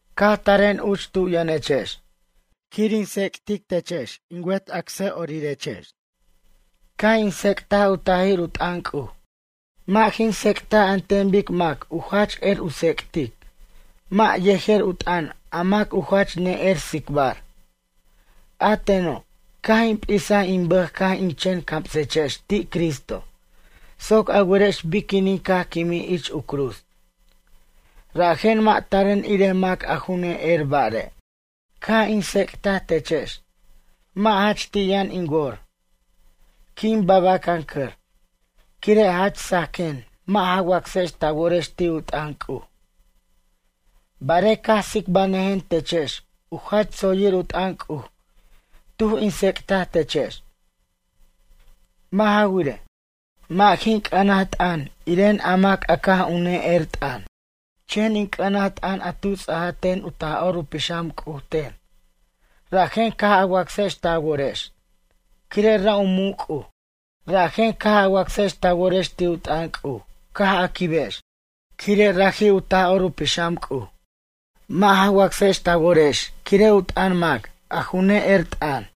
Caj taren uch tu yʌnechex, quir in tsec'tic techex in wet acsa'orirex. Caj in tsec'taj u tajir u t'ʌn C'uj. Mʌ' jin tsec'taj an ten bic mac u jach er u tsec'tic, mʌ' yejer u t'ʌn a mac a ju jach ne'er tsicbar. A teno', caj in p'isaj in bʌj ca' in chen camsechex ti' Cristo, soc a werex biquinin caj quimij ich u cruz. Rajen mʌ' taren irej mac a ju ne'er bare'. Caj in tsec'taj techex, mʌ' jach ti' yʌn in wor, quin babacʌncʌr, quire' jach sajquen mʌ' ja wacsex ta worex ti' u t'ʌn C'uj. Barej caj tsicbanʌjen techex u jach tsoyir u t'ʌn C'uj tuj in tsec'taj techex. Mʌ' ja wirej, mʌ' jin c'ʌnaj t'ʌn iren a mac a caj u ne'er t'ʌn. Chen in c'ʌnaj t'ʌn a tu ts'aja ten u Taj'or u Pixam C'uj ten, rajen caj a wacsex ta worex, quire' ra' u muc' C'uj. Rajen caj a wacsex ta worex ti' u t'ʌn C'uj caj a quibex, quire' raji' u Taj'or u Pixam C'uj. Mʌ' ja wacsex ta worex quire' u t'ʌn mac, a ju ne'er t'ʌn.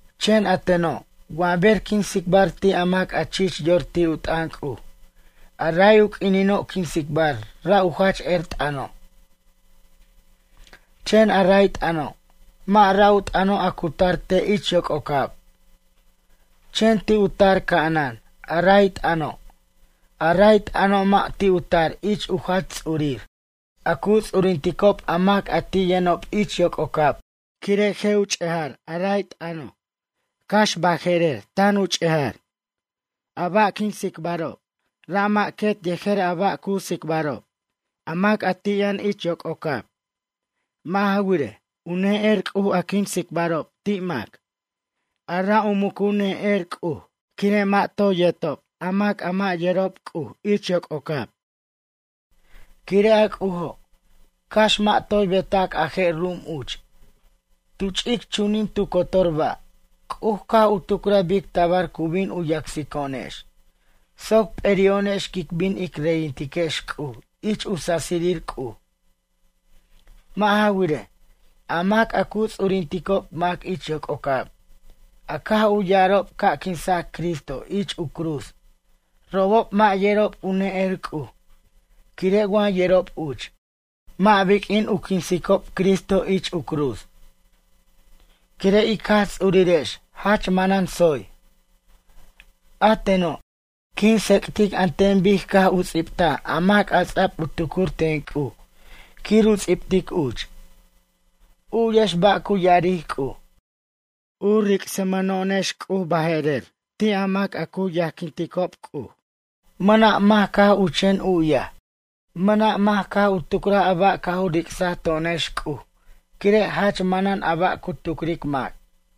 Chen a teno', wa ber quin tsicbar ti' a mac a chich yor ti' u t'ʌn C'uj, a ray u q'uinino' quin tsicbar ra' u jach er t'ʌno'. Chen a ray t'ʌno', mʌ' ra' u t'ʌno' a cu tar te' ich yoc'ocab, chen ti' u tar ca'anan a ray t'ʌno'. A ray t'ʌno' mʌ' u ti' u tar ich u jach ts'urir, a cu ts'urinticob a mac a ti' ich yʌnob yoc'ocab, quire' je' u ch'ejar a ray t'ʌno', cax baje'rer tan u ch'eja'ri'. A ba' quin tsicbarob, ra' mʌ' quet yejer a ba' cu tsicbarob, a mac a ti' yʌn ich yoc'ocab. Mʌ' ja wirej, u ne'er C'uj a quin tsicbarob ti' mac, a ra' u mucu ne'er C'uj, quire' mʌ' toy yertob a mac a mʌ' yerob C'uj ich yoc'ocab. Quire' a C'ujo', cax mʌ' toy betac a je' ru'um uch, tu ch'ic chunin tu cotor ba', C'uj caj u tucraj bic tabar cu bin u yacsico'onex, soc p'eri'o'onex quic bin ic reyintiquex C'uj ich u sasirir C'uj. Mʌ' ja wirej, a mac a cu ts'urinticob mac ich yoc'ocab, a caj u ya'arob ca' quinsac Cristo ich u cruz, robob mʌ' yerob u ne'er C'uj quire' wa yerob uch, mʌ' biq'uin u quinsob Cristo ich u cruz. Quire' ic Jaj Ts'urirex jach manan tsoy. A teno', quin tsec'tic an ten bic caj u ts'ibtaj a mac ts'a'b u tucur ten C'uj quir u ts'ibtic uch. U'yex ba' cu ya'aric C'uj: U ric'samʌno'onex C'uj baje'rer, ti' mac a cu yajquinticob C'uj. Mʌna' mac caj u chen u'yaj, mʌna' mac caj u tucraj a ba' caj u ric'saj to'onex C'uj, quire' jach manan a ba' cu tucric mac.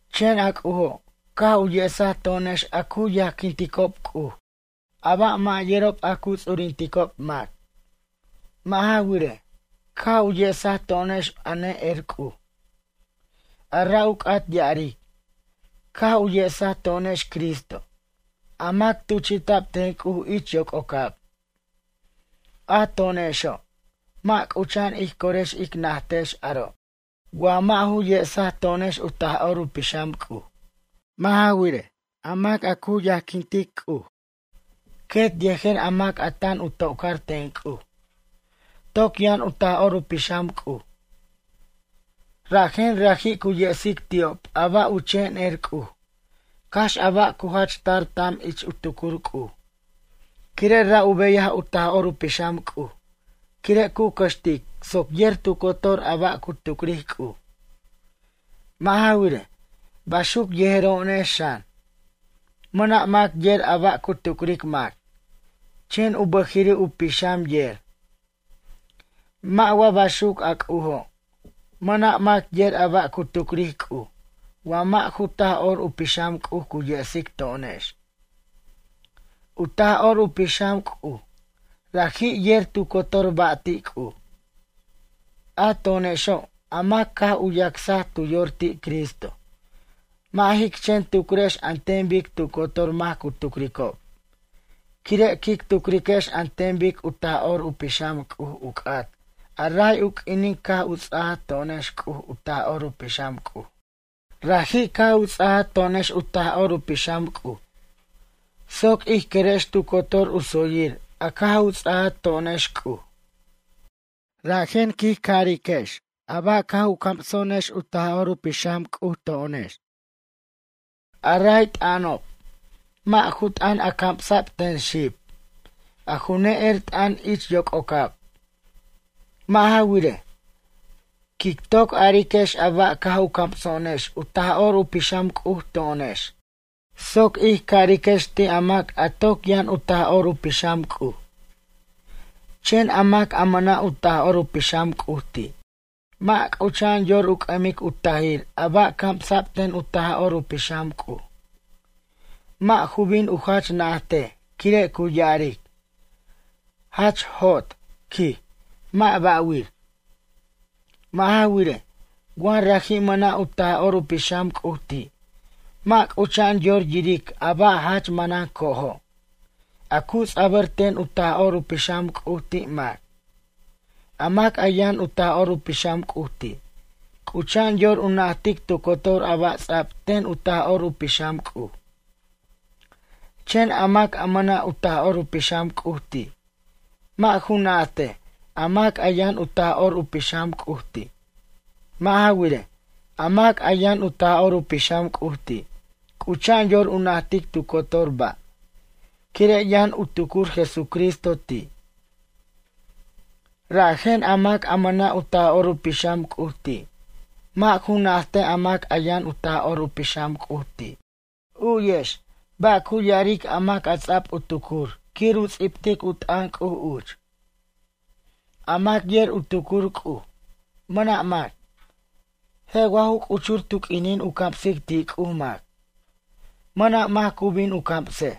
Chen a C'ujo', caj u yesaj to'onex a cu yajquinticob C'uj, a ba' mʌ' yerob a cu ts'urinticob mac. Mʌ' ja wirej, caj u yesaj to'onex a ne'er C'uj. A ra' u c'at ya'aric, caj u yesaj to'onex Cristo, a mac tuchi'ta'b ten C'uj ich yoc'ocab. A to'onexo', mʌ' c'ucha'an ij corex ic najtex aro', wa mʌ' ju yesaj to'onex u Taj'or u Pixam C'uj. Mʌ' ja wirej, a mac a cu yajquintic C'uj, quet yejer a mac a tan u to'car ten C'uj, toc yʌn u Taj'or u Pixam C'uj. Rajen raji' cu yesic ti'ob a ba' u chen er C'uj, cax a ba' cu jach tar tam ich u tucur C'uj. Quire' ra' u beyaj u Taj'or u Pixam C'uj, quire' cu cʌxtic soc yer tu cotor a ba' cu tucric C'uj. Mʌ' ja wirej, baxuc yejero'onex xan. Mʌna' mac yer a ba' cu tucric mac, chen u bʌjiri' u pixam yer. Mʌ' wa baxuc a C'ujo'? Mʌna' mac yer a ba' cu tucric C'uj wa mʌ' ju Taj'or u Pixam C'uj cu yesic to'onex. U Taj'or u Pixam C'uj, raji' yer tu cotor ba' ti' C'uj. A to'onexo', a mac caj u yacsaj tu yor ti' Cristo, mʌ' jic chen tucrex an ten bic tu cotor mac cu tucricob, quire' quic tucriquex an ten bic u Taj'or u Pixam C'uj u c'at a ray u q'uinin caj u ts'aja to'onex C'uj u Taj'or u Pixam C'uj. Raji' caj u ts'aja to'onex u Taj'or u Pixam C'uj soc ij querex tu cotor u tsoyir a caj u ts'aja to'onex C'uj. Rajen quij cariquex a ba' caj u camso'onex u Taj'or u Pixam C'uj to'onex. A ray t'ʌnob, mʌ' ju t'ʌn a camsa'b ten xib, a ju ne'er t'ʌn ich yoc'ocab. Mʌ' ja wirej, quic toc ariquex a ba' caj u camso'onex u Taj'or u Pixam C'uj to'onex, soc ij cariquex ti' a mac a toc yʌn u Taj'or u Pixam C'uj. Chen a mac a mʌna' u Taj'or u Pixam C'uj ti', mʌ' c'ucha'an yor u c'ʌmic u tajir a ba' camsa'b ten u Taj'or u Pixam C'uj. Mʌ' ju bin u jach najtej quire' cu ya'aric: “Jach jot, quij, mʌ' bʌ' wir.” Mʌ' ja wirej, wa raji' mʌna' u Taj'or u Pixam C'uj ti', mʌ' c'ucha'an yor yiric a ba' jach manan co'ojo', a cu ts'abʌr ten u Taj'or u Pixam C'uj ti' mac. A mac a yʌn u Taj'or u Pixam C'uj ti', c'ucha'an yor u najtic tu cotor a ba' ts'ab ten u Taj'or u Pixam C'uj. Chen a mac a mʌna' u Taj'or u Pixam C'uj ti', mʌ' ju najtej a mac a yʌn u Taj'or u Pixam C'uj ti'. Mʌ' ja wirej, a mac a yʌn u Taj'or u Pixam C'uj ti', c'ucha'an yor u najtic tu cotor ba', quire' yʌn u tucur Jesucristo ti'. Rajen a mac a mʌna' u Taj'or u Pixam C'uj ti', mʌ' ju najtej a mac a yʌn u Taj'or u Pixam C'uj ti'. U'yex, ba' cu ya'aric a mac a ts'ab u tucur quir u ts'ibtic u t'ʌn C'uj uch. “A mac yer u tucur C'uj? Mʌna' mac. Je' wa ju c'uchur tu q'uinin cu camsic ti' C'uj mac? Mʌna' mac cu bin u camsej.”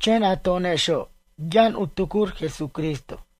Chen a to'onexo', yʌn u tucur Jesucristo.